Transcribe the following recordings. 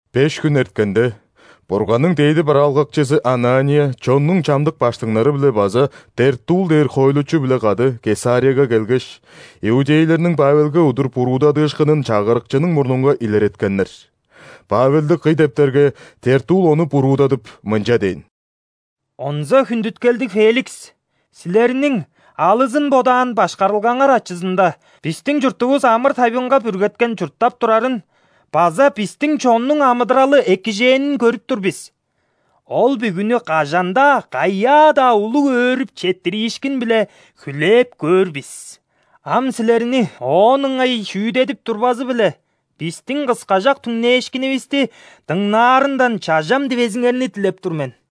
Беш хүн эрткенде, Бурганның дээди бараалгакчызы Анания чоннуң чамдык ·баштыңнары-биле база Тертулл дээр хоойлучу-биле кады Кесарияга келгеш, иудейлерниң Павелге удур буруудадыышкынын чагырыкчының мурнунга илереткеннер. Павелди кый дептерге, Тертулл ону буруудадып, мынча дээн: «Онза хүндүткелдиг Феликс! Силерниң алызын бодаан башкарылгаңар ачызында бистиң чуртувус амыр-тайбыңга бүргеткен чурттап турарын база бистиң чоннуң амыдыралы экижээнин көрүп тур бис. Ол бүгүнү кажан-даа, каяа-даа улуг өөрүп четтириишкин-биле хүлээп көөр бис. Ам силерни оон ыңай шүүдедип турбазы-биле, бистиң кыскажак түңнээшкинивисти дыңнаарындан чажам дивезиңерни дилеп тур мен.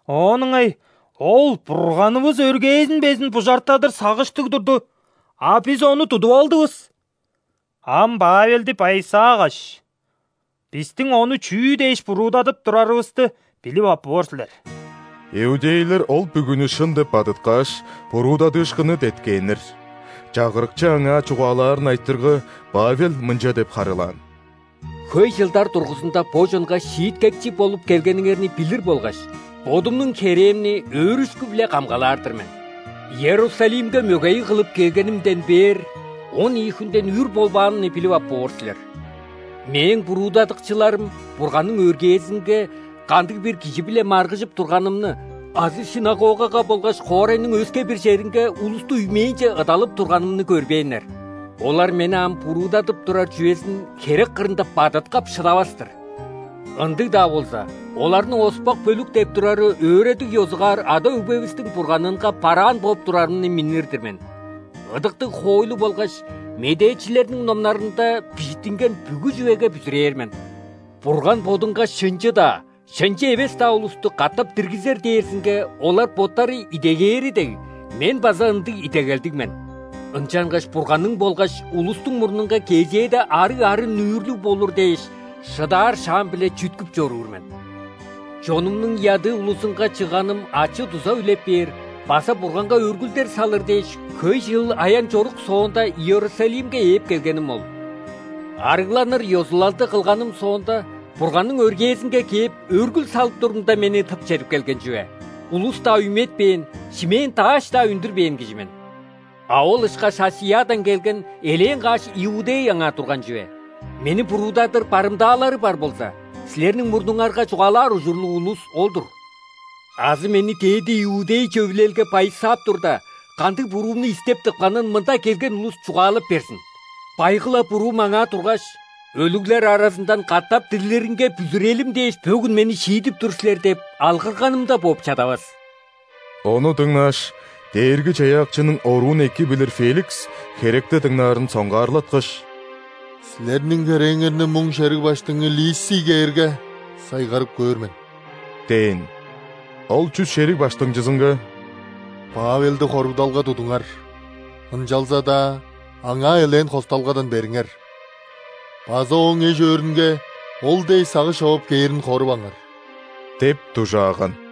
Оон ыңай ол Бурганывыс өргээзин безин бужартадыр сагыштыг турду, а бис ону тудуп алдывыс. Ам Павелди байысаагаш, бистиң ону чүү дээш буруудадып турарывысты билип ап боор силер». Иудейлер ол бүгүнү шын деп бадыткааш, буруудадыышкынны деткээннер. Чагырыкчы аңаа чугаалаарын айтырга, Павел мынча деп харыылаан: «Хөй чылдар дургузунда бо чонга шииткекчи болуп келгениңерни билир болгаш, бодумнуң херээмни өөрүшкү-биле камгалаар-дыр мен. Иерусалимге мөгейиг кылып келгенимден бээр, он ийи хүнден үр болбаанымны билип ап боор силер. Мээң буруудадыкчыларым Бурганның өргээзинге кандыг-бир кижи-биле маргыжып турганымны азы ·синагогага болгаш хоорайның өске-бир черинге улусту үймээнче ыдалап турганымны көрбээннер. Олар мени ам буруудадып турар чүвезин херек кырында бадыткап шыдавас-тыр. Ындыг-даа болза, оларның „оспак бөлүк“ деп турары өөредиг ёзугаар ада-өгбевистиң Бурганынга бараан бооп турарымны миннир-дир мен. Ыдыктыг хоойлу болгаш медээчилерниң номнарында бижиттинген бүгү чүвеге бүзүрээр мен. Бурган Бодунга шынчы-даа, шынчы эвес-даа улусту катап диргизер дээрзинге олар боттары идегээри дег, мен база ындыг идегелдиг мен. Ынчангаш Бурганның болгаш улустуң мурнунга кезээде арыг арын-нүүрлүг болур дээш, шыдаар шаам-биле чүткүп чоруур мен. Чонумнуң ядыы улузунга чыгганым ачы-дуза үлеп бээр база Бурганга өргүлдер салыр дээш, хөй чыл аян-чорук соонда, Иерусалимге ээп келгеним ол. Арыгланыр ёзулалды кылганым соонда, Бурганның өргээзинге кээп, өргүл салып турумда, мени тып чедип келген чүве. Улус-даа үйметпээн, шимээн-дааш-даа үндүрбээн кижи мен. А ол ышкаш ·Асиядан келген элээн каш иудей аңаа турган чүве. Мени буруудадыр барымдаалары бар болза, силерниң мурнуңарга чугаалаар ужурлуг улус ол-дур. Азы мени ·дээди иудей Чөвүлелге байысаап турда, кандыг буруумну истеп тыпканын мында келген улус чугаалап берзин. Байгы-ла буруум – аңаа тургаш: „Өлүглер аразындан катап дирлиринге бүзүрелим дээш, бөгүн мени шиидип тур силер“ – деп алгырганымда бооп чадавас». Ону дыңнааш, Дээрги-Чаяакчының оруун эки билир Феликс херекти дыңнаарын соңгаарлаткаш: «Силерниң херээңерни муң шериг баштыңы Лисий кээрге, сайгарып көөр мен» – дээн. Ол чүс шериг баштыңчызынга: «Павелди хоругдалга тудуңар, ынчалза-даа аңаа элээн хосталгадан бериңер база ооң эш-өөрүнге ол дээш сагыш човап кээрин хоруваңар» – деп дужааган.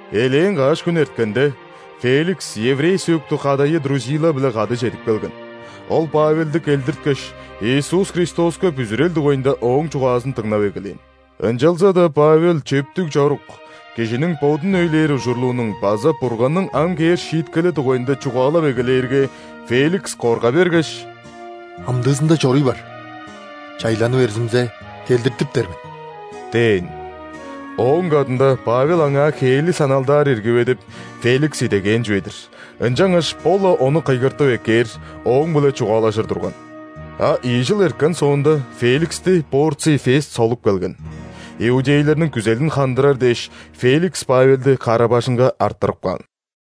Элээн каш хүн эрткенде, Феликс еврей сөөктүг кадайы Друзилла-биле кады чедип келген. Ол Павелди келдирткеш, Иисус Христоска бүзүрел дугайында ооң чугаазын дыңнап эгелээн. Ынчалза-даа Павел чөптүг чорук, кижиниң бодун өйлээр ужурлуунуң база Бурганның ам кээр шииткели дугайында чугаалап эгелээрге, Феликс корга бергеш: «Амдыызында чоруй бар, чайланы берзимзе, келдиртиптер мен» – дээн. Ооң кадында Павел аңаа хээли саналдаар ирги бе деп, Феликс идегээн чүве-дир, ынчангаш бо-ла ону кыйгыртып эккээр, ооң-биле чугаалажыр турган. А ийи чыл эрткен соонда, Феликсти Порций Фест солуп келген. Иудейлерниң күзелин хандырар дээш, Феликс Павелди кара-бажыңга арттырып каан.